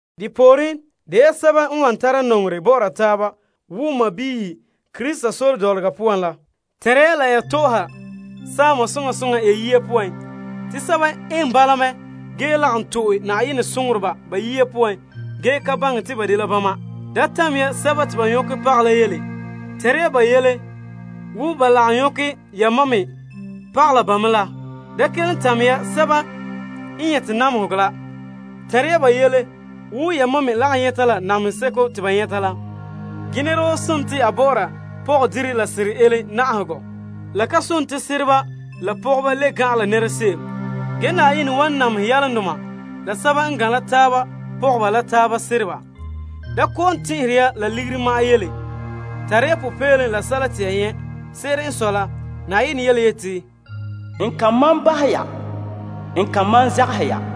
De pooren, de ya sɛba n wan tara nɔŋerɛ bɔ'ɔra taaba wo sɔɔnrɔ Krista sore dɔlɔga poan la. Tɛnre ya la ya tɔ'ɔha saama soŋa soŋa ya yiya poan. Te sɛba eŋɛ bala mɛ ge lagom to'e Na'ayenɛ soŋoreba ba yiya poan ge ka baŋɛ te ba dela bama. Da tamɛ ya sɛba te ba nyɔkɛ pagɛ la yele. Tɛnra ba yele wo ba lagom nyɔkɛ yamam me pagɛ la ba me la. Da kelom tamɛ ya sɛba me n nyɛte namehegɔ la. Tɛnre ya ba yele wo yamam me lagom nyɛta la namehe seko te ba nyɛta la. Ge nɛra woo sontii a bɔ'ɔra pɔgɔdire la sera ele na'ahegɔ. Sereba la pɔgɔba dɛna birikindoma la taaba. Ge Na'ayenɛ wan namehɛ sɛba n tone yalomdoma la sɛba n tone kabonhe. Da ba' kɔ'ɔn tɛn'ɛhe ya la ligiri ma'an yele. Tare ya popeelom la sɛla te ya nyɛ'. Se'ere n sɔe la, Na'ayenɛ yeti, N kan malom bahɛ ho, bii n zagahɛ ho.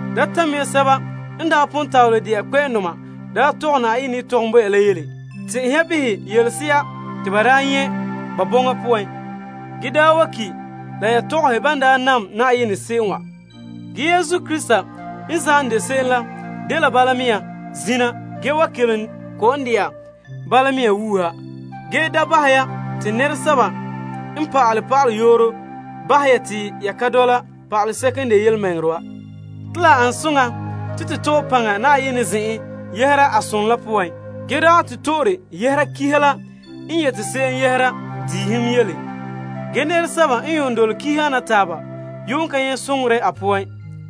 Da tamɛ ya kpɛ'ɛndoma n daa tɔgɛ Na'ayenɛ yetɔgom bo ya la yele. Tɛn'ɛhɛ ya behɛ yelese'a te ba daa nyɛ' ba bɔŋa poan ge daa wa ki' la ya tɔgɔhɛ ban daa nam Na'ayenɛ se'em wa. Yesu Krista n zam de se'em la dela bala mea zina ge wan kelom dɛna la bala mea wuuha! Ge da bahɛ ya te nɛresɛba n pa'ale pa'aleyooro bahɛ ya te ya ka dɔla pa'aleseko n de yelemɛŋɛrɛ wa. Te la an soŋa te to to'e paŋa Na'ayenɛ zen'en yɛhera a som la poan ge dagɛ to to'e de doohe la dia kihiga poan. Ge nɛresɛba n yuun dole dia kiha ana taaba yuun ka nyɛ' soŋore a poan.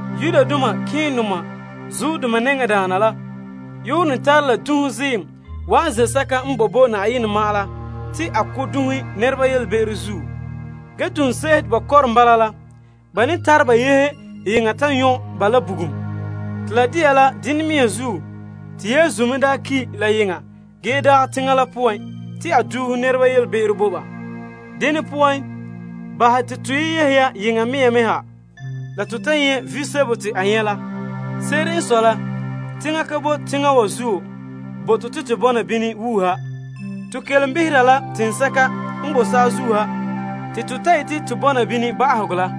Malema nɛŋadaana la ne tare la dunhe ziim wa'an toolom zen'an ge ba duuhe nɛreba be'em la zuo, ge duŋse'ehe te ba kɔrom bala la, ba ne tare ba yehe yeŋa ta nyɔ' ba la bugum. Te la dela dene mea zuo te Yesu me daa ki' la yeŋa ge dagɛ teŋa la poan te duuhe nɛreba be'em la a ziim la. Dene poan, bahɛ te to lagom yehe ya yeŋa te to ta lagom nyɛ' visebo te a nyɛ' la. Se'ere n sɔe la, teŋa ka boe teŋa wa zuo bo to te to bɔna bini wuuha. To kelom behera la teŋsɛka n bo saazuo ha te to ta yete to bɔna bini ba'ahegɔ la.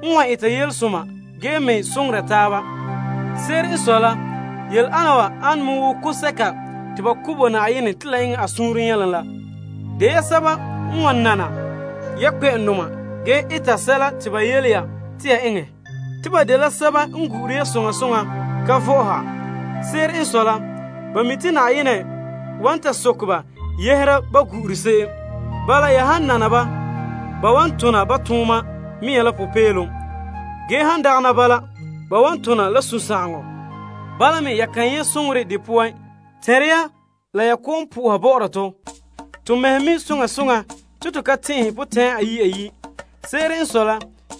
De ya sɛba n wan eta yelesoma ge me soŋora taaba. Se'ere n sɔe la, yele ana wa ane wo kaanbegɔ bo'olom bo Na'ayenɛ te la eŋɛ a suunre nyɛlom la. Nana ya kpɛ'ɛndoma ge eta sɛla te ba yele ya te ya eŋɛ. Ba gu'ure ya soŋa soŋa ka vɔ'ɔha te ba mi' te Na'ayenɛ wan ta soke ba yɛhera ban gu'ure se'em. Ya han nana ba, ba na tona ba tooma mea la popeelom ge han dagana bala, ba wan tona la sunsagaŋɔ. Bala me ya kan nyɛ' soŋorɛ de poan. Tɛnre ya la ya kɔ'ɔn po'oha bɔ'ɔra tɔ. To mɛhe mi' soŋa soŋa te to ka tɛn'ɛhe potɛn'ɛra ayi' ayi'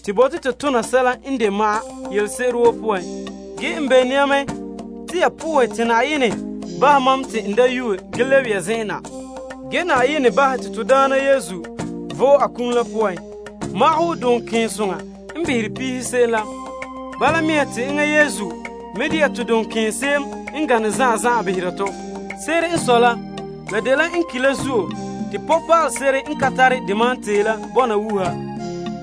te to bote to tona sɛla n de ma'an yelese'ere woo poan. Ge n bene ya mɛ te ya po'ohɛ te Na'ayenɛ bahɛ mam te n da yuue ge lebe ya zen'en na. Na'ayenɛ bahɛ te to Daana Yesu vo'e a kum la poan te magahɛ wo duŋkeensoŋa n behere peehe se'em la, bala mea te enŋa Yesu me de'a to duŋkeense'em n gane zan'an zan'an behera tɔ ge la dela en ki' la zuo te nɔbiŋpaale se'ere n ka tare de malom tee la bɔna wuuha.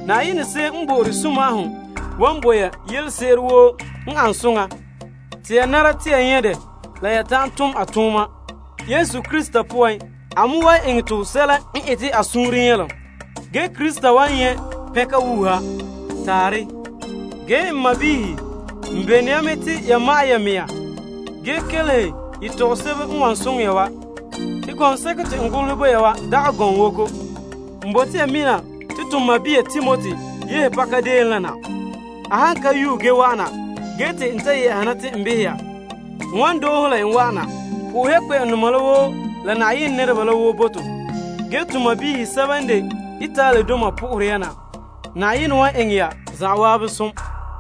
Na'ayenɛ se'em n bo'ore sunma'ahom la, wan bo ya yelese'ere woo n an soŋa te ya nara te ya nyɛ' dɛ la ya ta'an tom a tooma. Yesu Krista poan, a me wan eŋɛ tɔ sɛla n ete a suunre nyɛlom ge Krista wan nyɛ' pɛnka wuuha. Taarɛ. Ge n sɔɔnrɔ, n bene ya mɛ te ya ma'ɛn ya mɛŋa ge kelehe n yetɔgom sebo n wan soŋɛ ya wa. Te gɔŋseko te n golehɛ bo ya wa dagɛ gɔŋwoko. N bote ya mina te to sɔɔn Timoti yehe pakadeen la na. A han ka yuue ge wa'an na, ge te n ta yɛ'a na te n behɛ ya, n wan doohe la en wa'ana. Po'ohɛ ya kpɛ'ɛndoma la woo la Yenɛ nɛreba la woo bo to. Ge to sɔɔnrɔ sɛba n de Italidoma po'ohere ya na. Na'ayenɛ wan eŋɛ ya zan'an som.